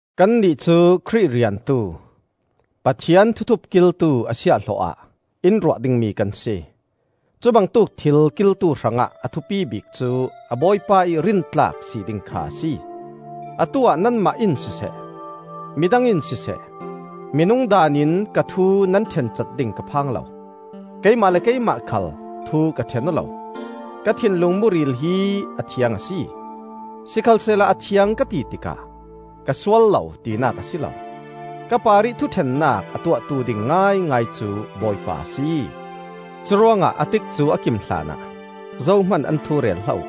Kannih cu Khrih riantu, Pathian thuthup kiltu a siahhlawh-ah in ruah dingmi kan si. Cubangtuk thil kiltu hrangah a thupi bik cu a bawipa ih rintlak si ding kha a si. Atu-ah nanmah in siseh, mi dang in siseh, minung daan in ka thu nan ṭhencat ding ka phang lo. Keimah le keimah khal thu ka ṭhen aw lo. Ka thinlung muril hi a thiang a si; sikhalsehla a thiang ka ti tikah ka sual lo tinak a si lo. Ka parih thuṭhennak a tuahtu ding ngaingai cu Bawipa a si. Curuangah a tikcu a kim hlanah zohman an thu rel hlah uh.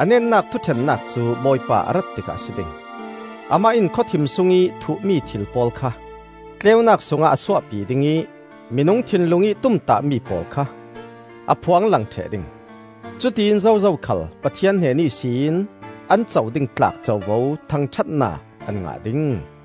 A netnak thuṭhennak cu Bawipa a rat tikah a si ding. Amah in khawthim sungih thuhmi thil pawl kha tleunak sungah a suahpi ding ih minung thinlung ih tumtahmi pawl kha a phuanglang ṭheh ding. Cutiin zozo khal Pathian hnen ihsin an co ding tlak covo thangṭhatnak an ngah ding.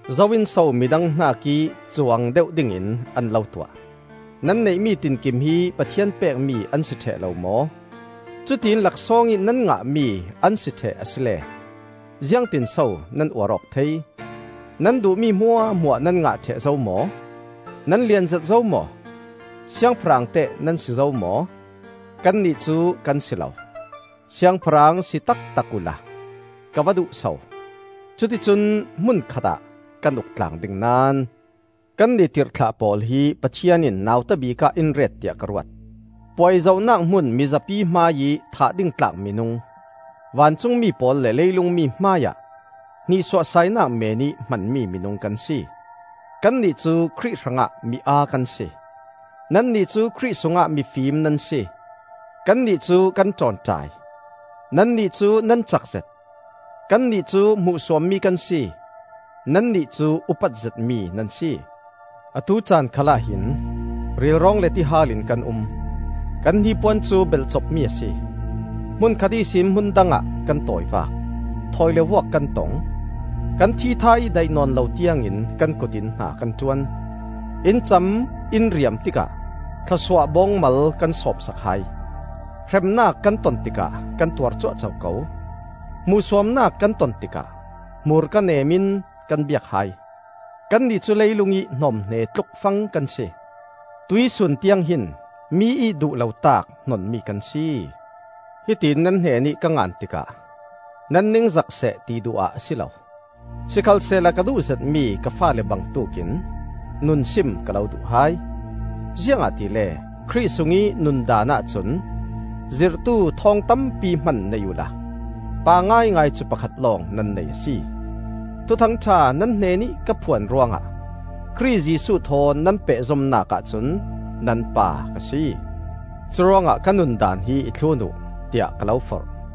Zo in so midang hnakih cuang deuh dingin an lo tuah? Nan neihmi tinkim hi Pathian pekmi an si ṭheh lo maw? Cutiin laksawng ih nan ngahmi an si ṭheh asile ziangtinso nan uar awk thei? Nan duhmi hmuahhmuah nan ngah ṭheh zo maw? Nan lianzet zo maw? Siangpahrang teh nan si zo maw? Kannih cu kan si lo! Siangpahrang si taktak uhla ka va duh so! Cuticun hmun khatah kan uk tlang ding naón! Kannih tirhthlah pawl hi Pathian in nauta bikah in ret tiah ka ruat; puai zohnak hmun mizapi hmaiih thah ding tlak minung, vancungmi pawl le leilungmi hmaiah hnihsuahsainak meenih hmanmi minung kan si. Kannih cu Khrih hrangah mi-aa kan si; nannih cu Khrih sungah mifim nan si! Kannih cu kan ṭawnṭai; nannih cu nan cakzet! Kannih cu hmuhsuammi kan si; nannih cu upat zetmi nan si! Atu caan khal ahhin rilrawng le tihal in kan um. Kan hnipuan cu belhcopmi a si; hmunkhat ihsin hmundang ah kan tawivak; thawi le vuak kan tong; Kan thitha ih daih nawn lo tiangin kan kut in hna kan ṭuan. In cam in riam tikah thlawsuah bawngmal kan sawmsak hai; hremnak kan ton tikah kan tuar cuahco ko; hmuhsuamnak kan ton tikah hmurka neem in kan biak hai. Kannih cu leilungih hnawmhne tluk fang kan si; tuihsun tiang hin mi ih duh lotaak hnonmi kan si. Hitiin nan hnenih ka ngan tikah nan ningzak seh ti duh ah a si lo; sikhalsehla ka duh zetmi ka faale bangtuk in nunsim ka lo duh hai. Ziangahtile Khrih sungih nundaan ahcun zirhtu thawng tampi hman nei uhla pa ngaingai cu pakhat lawng nan nei a si. Thuthang ṭha nan hnenih ka phuan ruangah Khrih Jesuh thawn nan pehzomnak ahcun nan pa ka si. Curuangah ka nun daan hi i thlun uh, tiah ka lo forh.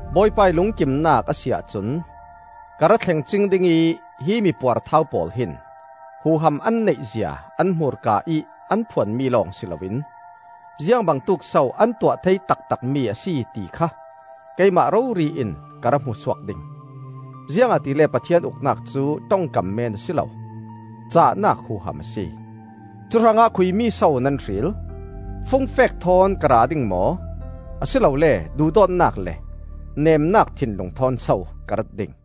Bawipa ih lungkimnak a si ahcun ka ra thleng cing ding ih hi mipuarthau pawl hin huham an neihzia an hmurka ih an phuanmi lawng si loin ziangbangtuk so an tuah thei taktakmi a si ti kha keimah rori in ka ra hmu suak ding. Ziangahtile Pathian Uknak cu ṭongkam men a si lo, cahnak huham a si. Cuhrangah khuimi so nan hril? Fungfek thawn ka ra ding maw, a si lole duhdawtnak le nemnak thinlung thawn so ka rat ding?